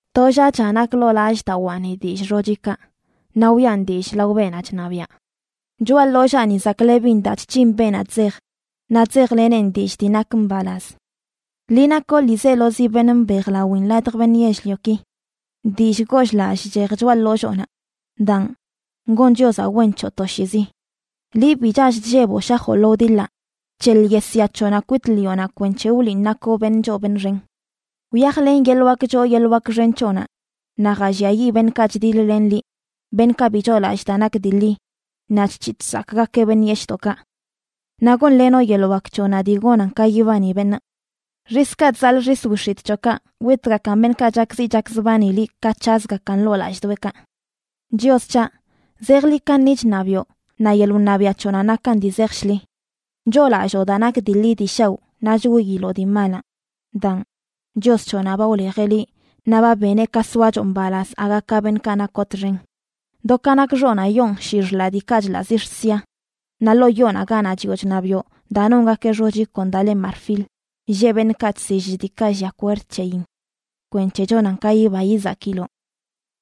To llaꞌcha nak ḻoo lallꞌdawaani dillꞌ xochikaꞌ naꞌ wiꞌan dillꞌ lao beenaꞌ chṉabiaꞌ. Choꞌa ḻollaani zaklebin daa chc̱hin beenaꞌ chzej, naꞌ chzejleneꞌn dillꞌ dii nak mbalaz. ¡Liꞌ nakoꞌ ḻiizelozi beṉꞌ mbejlawin ladj beṉꞌ yell-lioki! Dillꞌ goll-lallꞌ chchej choꞌa ḻolloonaꞌ. Daan, gon Chiozaꞌ wen c̱hoꞌ toshiizi. Liꞌ bi chall chlleboꞌ shajoꞌ lo wdiḻaꞌ, bc̱heḻ yesya c̱hoꞌnaꞌ kwit ḻiꞌonaꞌ, kwenc̱he wliꞌn nakoꞌ beṉꞌ choo beṉꞌ xen. Wyajlen yeḻꞌ wak choo yeḻꞌ wak xen c̱hoꞌnaꞌ naꞌ jalliayiꞌ beṉꞌkaꞌ chdiḻ-len liꞌ, beṉꞌkaꞌ bi choolallꞌ daa nak dii ḻi naꞌ chc̱hiꞌ chsakꞌgakeꞌ beṉꞌ yeshꞌdoꞌkaꞌ. Naꞌ gonlenoꞌ yeḻꞌ wak c̱hoꞌnaꞌ dii gonan ka yibani beṉꞌ. Xiskaꞌ chzaḻꞌ xis wix̱itꞌ c̱hoꞌkaꞌ witgakan beṉꞌkaꞌ chakziꞌ chakzbani liꞌ ka c̱hazgakan ḻoo lallꞌdoꞌekaꞌ. Chios c̱haꞌ, zejḻi kaṉi chṉabiꞌo, naꞌ yeḻꞌ wṉabiaꞌ c̱hoꞌnaꞌ nakan dii zej shḻi. Choolalloo daa nak dii ḻi dii shaoꞌ naꞌ chwiiloꞌ dii malaꞌ. Daan, Chios c̱hoꞌnaꞌ ba wlejeꞌ liꞌ naꞌ ba beneꞌ ka soachoꞌ mbalaz aga ka beṉꞌkaꞌ nakoꞌ txen. Do ka nak xoꞌnaꞌ yoon shii xḻaꞌ diikaꞌ chḻaꞌ zix̱ sia; naꞌ ḻoo yoonaꞌ ganaꞌ chiꞌo chṉabiꞌo daa nongakeꞌ xochi kon daa le marfil, lleꞌ beṉꞌkaꞌ chsill diikaꞌ llia kwerd c̱heyin kwenc̱he chonan ka yiba yizakiloꞌ.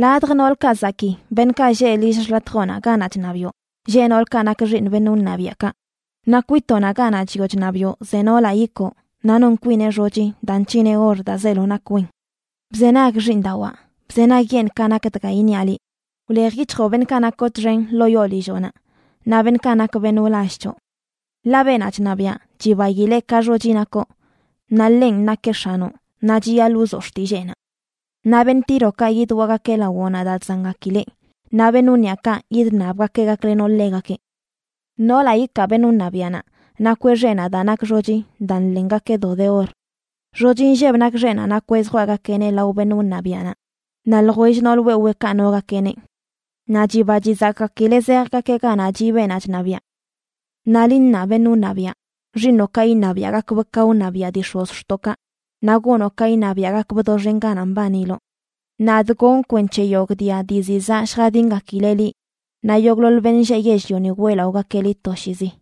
Ladj noolkaꞌ zakii, beṉꞌkaꞌ lleꞌ lill xḻatjoꞌnaꞌ ganaꞌ chṉabiꞌo, lleꞌ noolkaꞌ nak xiiṉ beṉꞌ wṉabiaꞌkaꞌ; naꞌ kwitoꞌnaꞌ ganaꞌ chiꞌo chṉabiꞌo ze noolaꞌ ikoo naꞌ non kwineꞌ xochi daa nc̱hineꞌ or daa zeelo nak wen. Bzenag, xiiṉdawaa, bzenagyeṉꞌ ka nak dga iṉiaꞌ liꞌ: Wlejyic̱hjoꞌ beṉꞌkaꞌ nakoꞌ txen ḻoo yoo lilloꞌnaꞌ naꞌ beṉꞌkaꞌ nak beṉꞌ wlall c̱hoꞌ. Ḻaꞌ beenaꞌ chṉabiaꞌ chibaileꞌ ka xochi nakoꞌ; naꞌ ḻenꞌ nakeꞌ x̱anoꞌ, naꞌ chiyaḻꞌ wzoꞌ xtilleenaꞌ. Naꞌ beṉꞌ Tírokaꞌ yidwaꞌgakeꞌ lawoꞌnaꞌ daa chzangakileꞌ, naꞌ beṉꞌ wniꞌakaꞌ yidṉabgakeꞌ gaklenoꞌ ḻegakeꞌ. Noolaꞌ ikaa beṉꞌ wṉabiaꞌnaꞌ nakweꞌ xeꞌnaꞌ daa nak xochi daa nḻengakeꞌ do de or. Xochi nlleb nak xeꞌnaꞌ nakweꞌ zjwaꞌgakeꞌneꞌ lao beṉꞌ wṉabiaꞌnaꞌ, naꞌ ljwell nool weweekaꞌ nogakeꞌneꞌ. Naꞌ chiba chizakꞌgakileꞌ zejgakeꞌ ganaꞌ chiꞌ beenaꞌ chṉabiaꞌ. Naꞌ liꞌ ṉaa, beṉꞌ wṉabiaꞌ, xiiṉoꞌkaꞌ iṉabiaꞌgakbꞌ ka wṉabiaꞌ dii x̱ozxtoꞌkaꞌ, naꞌ gonoꞌ ka iṉabiaꞌgakbꞌ doxen ganaꞌ mbaniloꞌ. Nadꞌ gonꞌ kwenc̱he yogꞌ dia dii ziꞌ zaꞌ lljadingakileꞌ liꞌ, naꞌ yogꞌḻoḻ beṉꞌ lleꞌ yell-lioni weꞌlaꞌogakeꞌ liꞌ toshiizi.